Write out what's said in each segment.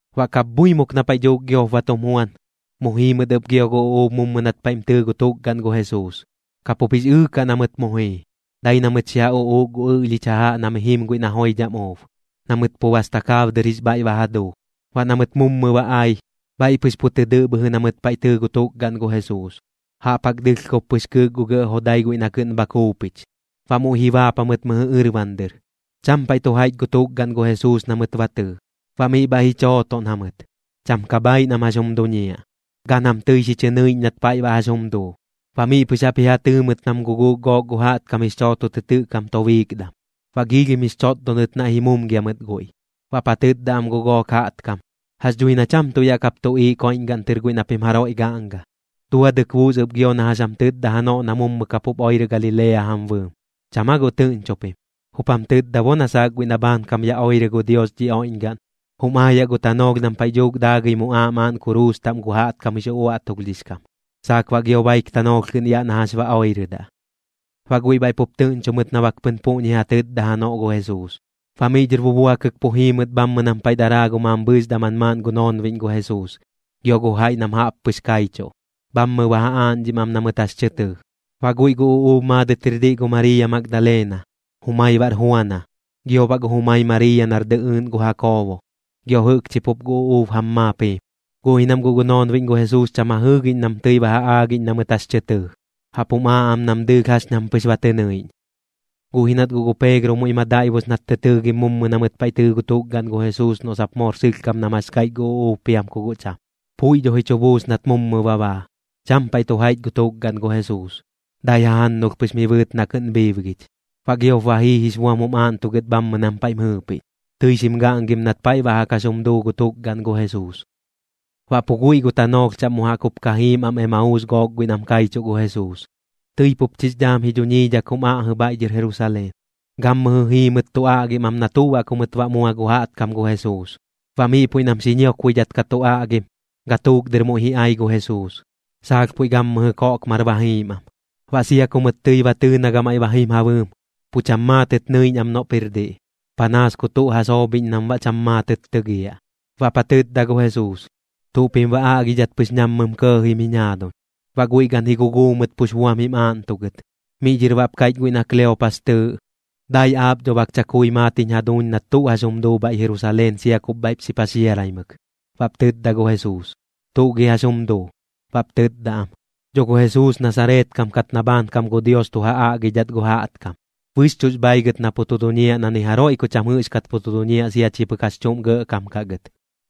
Baꞌ kapbhuimuk na paiꞌ dhuuk giop ba tum juan, mu jii mɨt ɨp gio gu uꞌuub mummɨ nat paiꞌm tɨɨ gu tukgaꞌn gu Jesuus. Ka pup jix ɨɨkaꞌ na mɨt mu jii, dai na mɨt xi ja uꞌuuk gu ɨꞌlhich jajaꞌ na mi jim guiꞌ na joidham uub, na mɨt pu bas takaab dɨr jix bhaiꞌ ba ja duu. Baꞌ na mɨt mummɨ ba ai, bhaiꞌ pɨx pu tɨ dɨꞌ bhɨjɨ na mɨt paiꞌ tɨɨ gu tukgaꞌn gu Jesuus, jaꞌp jaꞌk dɨlhkob pɨx kɨɨk gu gɇꞌ jodai guiꞌ na kɨꞌn bha kuupich. Baꞌ muiꞌ ji baap jamɨt mɨjɨ ɨrban dɨr. Cham paiꞌ tu jaiꞌch gu tukgaꞌn gu Jesuus na mɨt ba tɨɨ. Baꞌ miꞌ bhaiꞌ ji chootoꞌn jamɨt, cham ka bhaaiꞌ nam jax jum duñiaꞌ. Gan jam tɨi xi chɨ nɨiꞌñ nat paiꞌ baꞌ jax jum duu. Baꞌ miꞌ pɨx jaꞌp ji ja tɨɨ mɨt nam guguuk gook gu jaꞌtkam jix chooto tɨ tɨꞌ kam tobiikdam. Baꞌ giilhim jix chotdonɨt naiꞌ ji mumgia mɨt guiꞌ. Baꞌp ja tɨtda am gu gook jaꞌtkam: ―Jax dhui na cham tuꞌ yaꞌ kap tuꞌiiꞌ koiꞌñgaꞌn tɨr guiꞌ na pim jaroiꞌ gaꞌnga. Duadɨk buus ɨp gio na jax jam tɨtda janoꞌ na mummɨ kapup oirɨ Galilea jam bɨɨm. ¿Cham aa guꞌ tɨꞌñcho pim? Jup jam tɨtda bo na saak guiꞌ na bhaankam ya oirɨ gu Dios dhi oiꞌñgaꞌn, jum aayaꞌ gu tanoolh nam paiꞌ dhuuk daagɨi muꞌaaꞌ maaꞌn kuruus taꞌm gu jaꞌtkam jix uꞌuaꞌtulhdhix kam, saak baꞌ gio baik tanoolh kɨꞌn yaꞌ na jax ba oirɨdaꞌ. Baꞌ guiꞌ bhaiꞌ pup tɨꞌñcho mɨt na bak pɨn puꞌñi ja tɨtda janoꞌ gu Jesuus. Baꞌ miꞌ dhɨr bubuakɨk pu jii mɨt bhammɨ nam paiꞌ daraa gu mambhɨɨx daman maaꞌn gu noonbiꞌñ gu Jesuus, gio gu jaiꞌ nam jaꞌp pɨx kaichuꞌ, bhammɨ ba ja aaꞌñdhim am na mɨt jax tɨ tɨɨ. Baꞌ guiꞌ gu uꞌuub maadɨt jir diꞌ gu Mariiya Magdalena, jumai baꞌr Juana, gio baꞌ gu jumai Mariiya nar dɨꞌɨɨꞌn gu Jakoobo, gio jɨꞌkchi pup gu uꞌuub jam maap jiim. Guꞌ ji nam guꞌ gu noonbiꞌñ gu Jesuus cham ja jɨɨgiꞌñ nam tɨi ba ja aagiꞌñ na mɨt jax tɨ tɨɨ, jaꞌp jum aaꞌ am nam dɨɨlh jax ñam pɨx ba tɨ nɨiꞌñ. Guꞌ ji nat guꞌ gu Peegro muiꞌ ma daiꞌbus nat tɨ tɨɨgim mummɨ na mɨt paiꞌ tɨɨ gu tukgaꞌn gu Jesuus noꞌ sap moor sɨlhkam nam jax kaiꞌch gu uꞌuub piam ku guꞌ cham. Puiꞌ dho ji chu buus nat mummɨ ba baa, cham paiꞌ tu jaiꞌch gu tukgaꞌn gu Jesuus, dai jajannulh pɨx mi bɨɨt na kɨꞌn bhiibgich. Baꞌ giop ba jii jix buam jum aaꞌntugɨt bhammɨ nam paiꞌm jɨɨpiꞌñ, tɨi xim gaꞌngim nat paiꞌ baꞌ jaꞌk jax jum duu gu tukgaꞌn gu Jesuus. Baꞌ pu guiꞌ gu tanoolh chaꞌm mu jaꞌk jup ka jiim am Emauus gook guiꞌ nam kaichuꞌ gu Jesuus, tɨi pup chix dhaam ji dhuñiidhak jum aꞌjɨ bhaiꞌ dhɨr Jerusaleen. Gammɨjɨ jii mɨt tu aꞌgim am na tuꞌ baꞌ ku mɨt baꞌ mua gu jaꞌtkam gu Jesuus. Baꞌ miꞌ puiꞌ nam xi ñiokbuidhat ka tu aꞌgim, gatuuk dɨr muiꞌ ji ai gu Jesuus, saalh puiꞌ gammɨjɨ koꞌkmar ba jiim am. Baꞌ sia ku mɨt tɨi ba tɨɨ na gamaiꞌ ba jim ja bɨɨm, pu cham maatɨt nɨiꞌñ am noꞌp jir diꞌ, panaas ku tuꞌ ja soobhiꞌñ nam baꞌ cham maatɨt tɨgiaꞌ. Baꞌp ja tɨtda gu Jesuus: ―¿Tuꞌ pim baꞌ aꞌgidhat pɨx nammɨm kɇɇjim jiñ jaaduñ? Baꞌ guiꞌ gan ji guguu mɨt pux buam jim aaꞌntugɨt. Miꞌ dhɨr baꞌp kaiꞌch guiꞌ na Kleopas tɨɨꞌ: ―Dai aap dho bak chakui maat jiñ jaduuñ nat tuꞌ jax jum duu bhaiꞌ Jerusaleen sia kup bhaiꞌp xi paxiaraimɨk. Baꞌp tɨtda gu Jesuus: ―¿Tuꞌ gi jax jum duu? Baꞌp tɨtda am: ―Dho gu Jesuus Nasareet kam kat na bhaankam gu Dios tu ja aꞌgidhat gu jaꞌtkam. Bɨxchuꞌx bhaaigɨt na pu tu duñiaꞌ na ni jaroiꞌ ku cham jɨꞌxkat pu tu duñiaꞌ sia chi pɨk jax chuꞌm gɇꞌkam kaꞌ gɨt,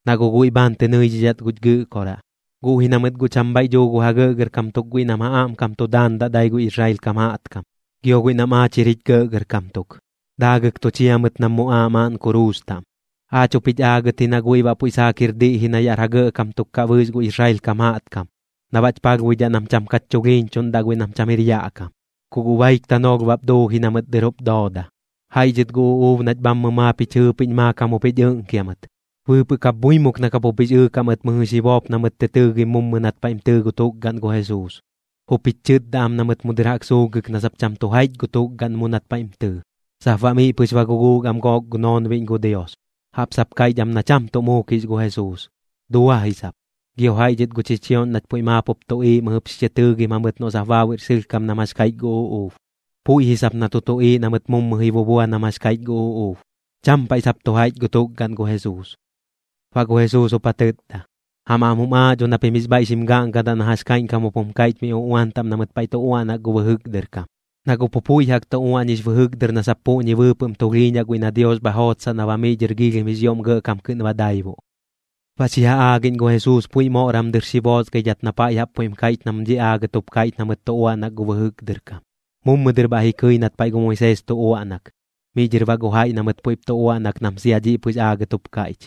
na guꞌ guiꞌ bhaan tɨ nɨidhidhat guch Gɨꞌkoraꞌ. Guꞌ ji na mɨt guꞌ cham bhaiꞌ dhuu gu ja gɇꞌgɇrkam tuk guiꞌ nam ja aꞌmkam tu daandaꞌ dai gu Israel kam jaꞌtkam, gio guiꞌ nam aach jir jich gɇꞌgɇrkam tuk, daagɨk tu chia mɨt nam muꞌaaꞌ maaꞌn kuruus taꞌm. Aach jup jich aagɨt ji na guiꞌ baꞌ puiꞌ saak jir diꞌ ji na yaꞌr ja gɇꞌkam tuk kaꞌ bɨɨx gu Israel kam jaꞌtkam, na baꞌch palhbuidhaꞌ nam cham kach chulhiiñchuꞌndaꞌ guiꞌ nam cham jir yaꞌ kam. Ku guꞌ baik tanoolh bap duu ji na mɨt dɨr jup dooda. Jaiꞌ dhɨt gu uꞌuub nach bhammɨ maap jich jɨɨpiꞌñ maakam jup jich ɨꞌnkia mɨt. Bɨɨpɨꞌ kapbhuimuk na kapup jix ɨɨkaꞌ mɨt mɨjɨ xi boop na mɨt tɨ tɨɨgim mummɨ nat paiꞌm tɨɨ gu tukgaꞌn gu Jesuus. Jup jich chɨtda am na mɨt mu dɨr jaꞌk suulhgɨk na sap cham tu jaiꞌch gu tukgaꞌn mu nat paiꞌm tɨɨ. Sap baꞌ miꞌ pɨx ba guguuk am gook gu noonbiꞌñ gu Dios, jaꞌp sap kaiꞌch am na cham tuꞌ muukix gu Jesuus, dua ji sap. Gio jaiꞌ dhɨt gu chichioꞌñ nach puiꞌ maap jup tuꞌiiꞌ mɨjɨp xi chɨ tɨɨgim jamɨt noꞌ sap baabuiꞌr sɨlhkam nam jax kaiꞌch gu uꞌuub. Puiꞌ ji sap na tu tuꞌiiꞌ na mɨt mummɨ ji bubua nam jax kaiꞌch gu uꞌuub. Cham paiꞌ sap tu jaiꞌch gu tukgaꞌn gu Jesuus. Baꞌ gu Jesuus jup ja tɨtda: ―Jam aꞌm jum aaꞌ dho na pim jix bhaiꞌ xim gaꞌngadaꞌ na jax kaiꞌñkam jup jum kaiꞌch mi uꞌuan taꞌm na mɨt tu uaꞌnak gu bɨjɨk dɨr kam. Na guꞌ pu puiꞌ jaꞌk tu uaꞌñix bɨjɨk dɨr na sap puꞌñi bɨɨpɨꞌm tulhiiñaꞌ guiꞌ na Dios bha jootsaꞌ na baꞌ miꞌ dhɨr giilhim jix ioꞌm gɇꞌkam kɨꞌn ba daibuꞌ. Baꞌ xi ja aagiꞌñ gu Jesuus puiꞌ moꞌram dɨr xi boosgaidhat na paiꞌ jaꞌp puiꞌm kaiꞌch nam dhiꞌ aagɨt jup kaiꞌch na mɨt tu uaꞌnak gu bɨjɨk dɨr kam. Mummɨ dɨr bhaiꞌ ji kɨi nat paiꞌ gu Moisees tu uaꞌnak, miꞌ dhɨr baꞌ gu jaiꞌ na mɨt puiꞌp tu uaꞌnak nam sia dhiꞌ pɨx aagɨt jup kaiꞌch.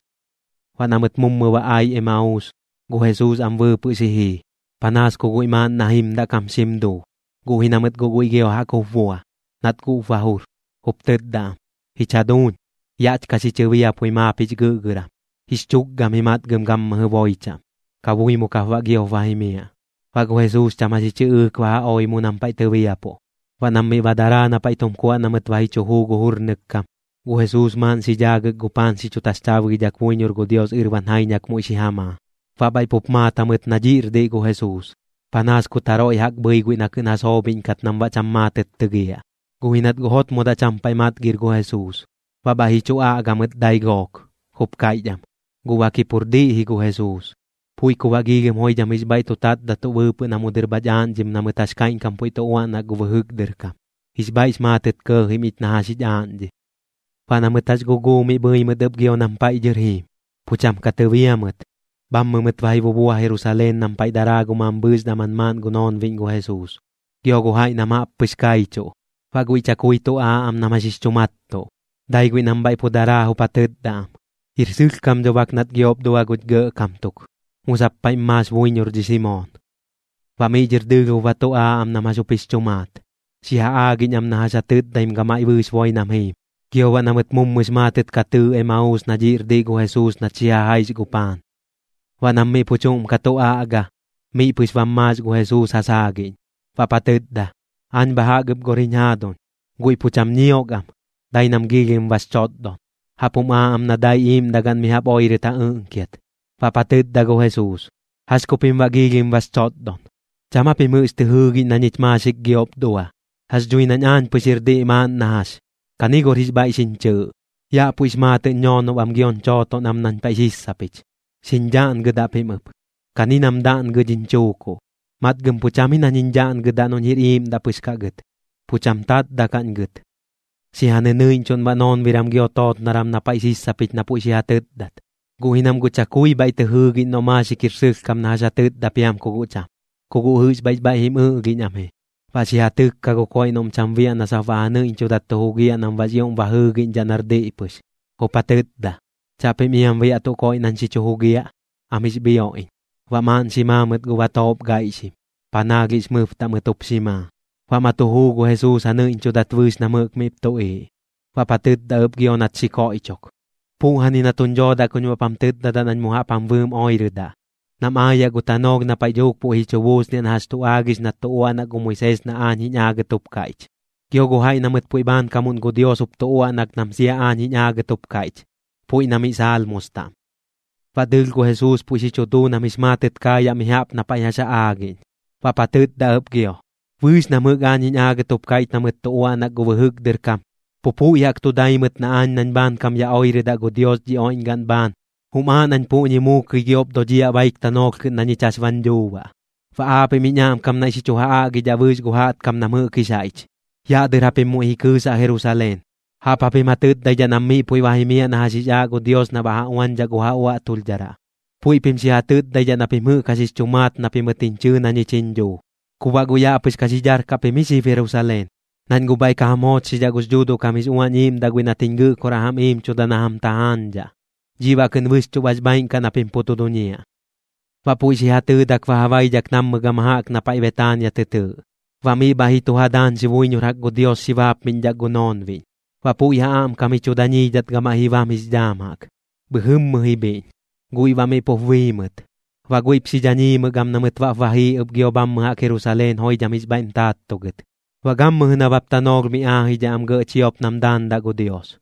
Baꞌ na mɨt mummɨ ba ai Emauus, gu Jesuus am bɨɨpɨꞌ muiꞌ xi jii, panaas ku guiꞌ maaꞌn na jimdaꞌ kam xim duu. Guꞌ ji na mɨt guꞌ guiꞌ gio jaꞌk jup bua, nat guꞌp ba jur, jup tɨtda am: ―Jich jaduuñ, yaꞌch ka xi chɨbiapui maap jix gɨꞌgɨram. Jix chukgam ji matgɨm gammɨjɨ boi chaꞌm. Kabuimuk jap baꞌ giop ba jimiaꞌ. Baꞌ gu Jesuus cham jax ji chɨꞌɨɨk ba ja oi ɨp mu nam paiꞌ tɨbiapuꞌ. Baꞌ nam miꞌ ba daraa na paiꞌ tum kuaꞌ na mɨt ba ji chu juu gu jurnɨk kam, gu Jesuus maaꞌn xi dhaagɨt gu paan xi chu taxchaabgidhak buiñor gu Dios ɨrban jaiñak muiꞌ xi ja maa. Baꞌ bhaiꞌ pup maat jamɨt na dhiꞌr diꞌ gu Jesuus, panaas kut jaroiꞌ jaꞌk bhɨi guiꞌ na kɨꞌn ja soobhiꞌñkat nam baꞌ cham maatɨt tɨgiaꞌ. Guꞌ ji nat guꞌ jotmodaꞌ cham paiꞌ matgir gu Jesuus. Baꞌ bhaiꞌ ji chu aꞌga mɨt dai gook, jup kaiꞌch am: ―Guꞌ bak ji pur diꞌ ji gu Jesuus. Puiꞌ ku baꞌ giilhim joidham jix bhaiꞌ tu tatdatuꞌ bɨɨpɨꞌ na mu dɨr bhach aaꞌñdhim na mɨt jax kaiꞌñkam puiꞌ tu uaꞌnak gu bɨjɨk dɨr kam. Jix bhaiꞌx maatɨt kɇɇjim ich na jax jich aaꞌñdhim. Baꞌ na mɨt jax guguu miꞌ bhɨi mɨt ɨp gio nam paiꞌ dhɨr jiim, pu cham ka tɨbia mɨt. Bhammɨ mɨt ba ji bubua Jerusaleen nam paiꞌ daraa gu mambhɨɨx daman maaꞌn gu noonbiꞌñ gu Jesuus, gio gu jaiꞌ nam jaꞌp pɨx kaichuꞌ. Baꞌ guiꞌ chakui tu aaꞌ am nam jax jix chu mattuꞌ, dai guiꞌ nam bhaiꞌ pu daraa jup ja tɨtda am: ―Jir sɨlhkam dho bak nat giop dua guch gɇꞌkam tuk. Mu sap paiꞌm maax buiñor dhi Simoon. Baꞌ miꞌ dhɨr dɨɨlh jup ba tu aaꞌ am nam jax jup jix chu maat, xi ja aagiꞌñ am na jax ja tɨtdaim gamaiꞌ bɨɨx boi nam jiim, gio baꞌ na mɨt mummɨx maatɨt ka tɨɨ Emauus na dhiꞌr diꞌ gu Jesuus nat xi ja jaix gu paan. Baꞌ nam miꞌ pu chuꞌm ka tu aꞌga, miꞌ pɨx bam maax gu Jesuus ja saagiꞌñ. Baꞌp ja tɨtda: ―Aañ bha jaꞌk ɨp gor jiñ jaaduñ. Guiꞌ pu cham ñiok am, dai nam giilhim bax chotdon. Jaꞌp jum aaꞌ am na dai iiꞌmdagaꞌn mi jaꞌp oirɨt ja ɨꞌnkiat. Baꞌp ja tɨtda gu Jesuus: ―¿Jax ku pim baꞌ giilhim bax chotdon? ¿Cham aa pim jɨꞌx tɨ jɨɨgiꞌñ na ñich maaxik giop dua? Jax dhui nañ aañ pɨx jir diꞌ maaꞌn na jax. Kani gor jix bhaiꞌ xiñ chɨɨꞌ. Yaꞌ puiꞌx maatɨꞌñ ñoonob am gioñ chooton am nañ paiꞌ sissapich. Xiñ dhaꞌngɨdaꞌ pim ɨp, kani nam daꞌngɨ dhiñ chuukuꞌ. Matgɨm pu cham ji nañ jiñ dhaꞌngɨdaꞌ noꞌñ jir iiꞌmdaꞌ pɨx kaꞌ gɨt, pu cham tatdaꞌkaꞌñ gɨt. Xi ja nɨnɨiꞌñchuꞌn baꞌ noonbiram gio tootnoram na paiꞌ sissapich na puiꞌ xi ja tɨtdat. Guꞌ ji nam guꞌ chakui bhaiꞌ tɨ jɨɨgiꞌñ noꞌ maaxik jir sɨlhkam na jax ja tɨtda piam ku guꞌ cham. Ku guꞌ jɨꞌx bhaiꞌx bhaiꞌ jim ɨꞌlhiꞌñ am ji. Baꞌ xi ja tɨkka gu koiꞌ noꞌm cham biaꞌ na sap baꞌ ja nɨiꞌñchudat tu jugiaꞌ nam baꞌx ioꞌm ba jɨɨgiꞌñdhaꞌ nar diꞌ pɨx, jup ja tɨtda: ―¿Chaꞌpim iam biaꞌ tuꞌ koiꞌ nañ xi chu jugiaꞌ? Am jix bhioꞌ iñ. Baꞌ maaꞌn xi maa mɨt gu batoop gaiꞌxim, panaalhiꞌx mɨbtaꞌ mɨt jup xi maa. Baꞌ ma tu juu gu Jesuus ja nɨiꞌñchudat bɨɨx nam jɨꞌk miꞌp tuꞌiiꞌ. Baꞌp ja tɨtda ɨp gio nat xi koiꞌchok: ―Puꞌjani na tuñ dhoodaꞌ kuñ baꞌp jam tɨtdadaꞌ nañ mu jaꞌp jam bɨɨm oirɨdaꞌ, nam aayaꞌ gu tanoolh na paiꞌ dhuuk puiꞌ ji chu buusniaꞌ na jax tu aagix nat tu uaꞌnak gu Moisees na aañ jiñ aagɨt jup kaiꞌch, gio gu jaiꞌ na mɨt puiꞌ bhaankamuꞌn gu Dios jup tu uaꞌnak nam sia aañ jiñ aagɨt jup kaiꞌch, puiꞌ na miꞌ Salmos taꞌm. Baꞌ dɨɨlh gu Jesuus puiꞌ xi chu duu nam jix maatɨt kaayaꞌ mi jaꞌp na paiꞌ jax ja aagiꞌñ. Baꞌp ja tɨtda ɨp gio: ―Bɨɨx nam jɨꞌk aañ jiñ aagɨt jup kaiꞌch na mɨt tu uaꞌnak gu bɨjɨk dɨr kam, pu puiꞌ jaꞌk tu dai mɨt na aañ nañ bhaankam ya oirɨdaꞌ gu Dios dhi oiꞌñgaꞌn bhaan, jum aaꞌ nañ puꞌñi muukɨi giop dodhiaꞌ baik tanoolh kɨꞌn na ñich jax bañ dhuu baꞌ. Baꞌ aapiꞌm jiñ aꞌmkam naiꞌ xi chu ja aꞌgidhaꞌ bɨɨx gu jaꞌtkam nam jɨꞌk jix jaiꞌch. Yaꞌ dɨr japim muiꞌ ji kɨɨsaꞌ Jerusaleen. Jaꞌp japim ja tɨtdaidhaꞌ nam miꞌ puiꞌ ba jimiaꞌ na jax jix aaꞌ gu Dios na baꞌ ja uañdhaꞌ gu ja uaꞌtulhdharaꞌ. Puiꞌ pim xi ja tɨtdaidhaꞌ na pim jɨꞌk jax jix chu maat na pimɨt jiñ chɨɨ na ñich jiñ dhuu. Ku baꞌ guꞌ yaꞌ pɨx ka xi darkaꞌ pim ji xib Jerusaleen, nañ guꞌ bhaiꞌ ka jam joochxidhaꞌ gux Dhuuduꞌ kam jix Uañ Iiꞌmdaꞌ guiꞌ nat jiñ Gɨꞌkoraꞌ jam iimchuda na jam tajaañdhaꞌ. Dhiꞌ baꞌ kɨꞌn bɨxchuꞌ bax bhaaiꞌn kaꞌ na pim pu tu duñiaꞌ. Baꞌ puiꞌ xi ja tɨɨdak ba ja baidhak nammɨ gama jaꞌk na paiꞌ Betaania tɨ tɨɨꞌ. Baꞌ miꞌ bhaiꞌ ji tu ja daañxi buiñor jaꞌk gu Dios xi baapmiꞌñdhak gu noonbiꞌñ. Baꞌ puiꞌ ja aꞌmkam ji chu dañiidhat gamaiꞌ ji bam jix dhaam jaꞌk, bhɨjɨmmɨ ji bhiꞌñ, guiꞌ baꞌ miꞌ pup bii mɨt. Baꞌ guiꞌp xi dhañiimɨk am na mɨt baꞌp ba jii ɨp gio bhammɨ jaꞌk Jerusaleen joidham jix bhaiꞌm taattugɨt. Baꞌ gammɨjɨ nabap tanoolh mi aajidhaꞌ am gɇꞌ chiop nam daandaꞌ gu Dios.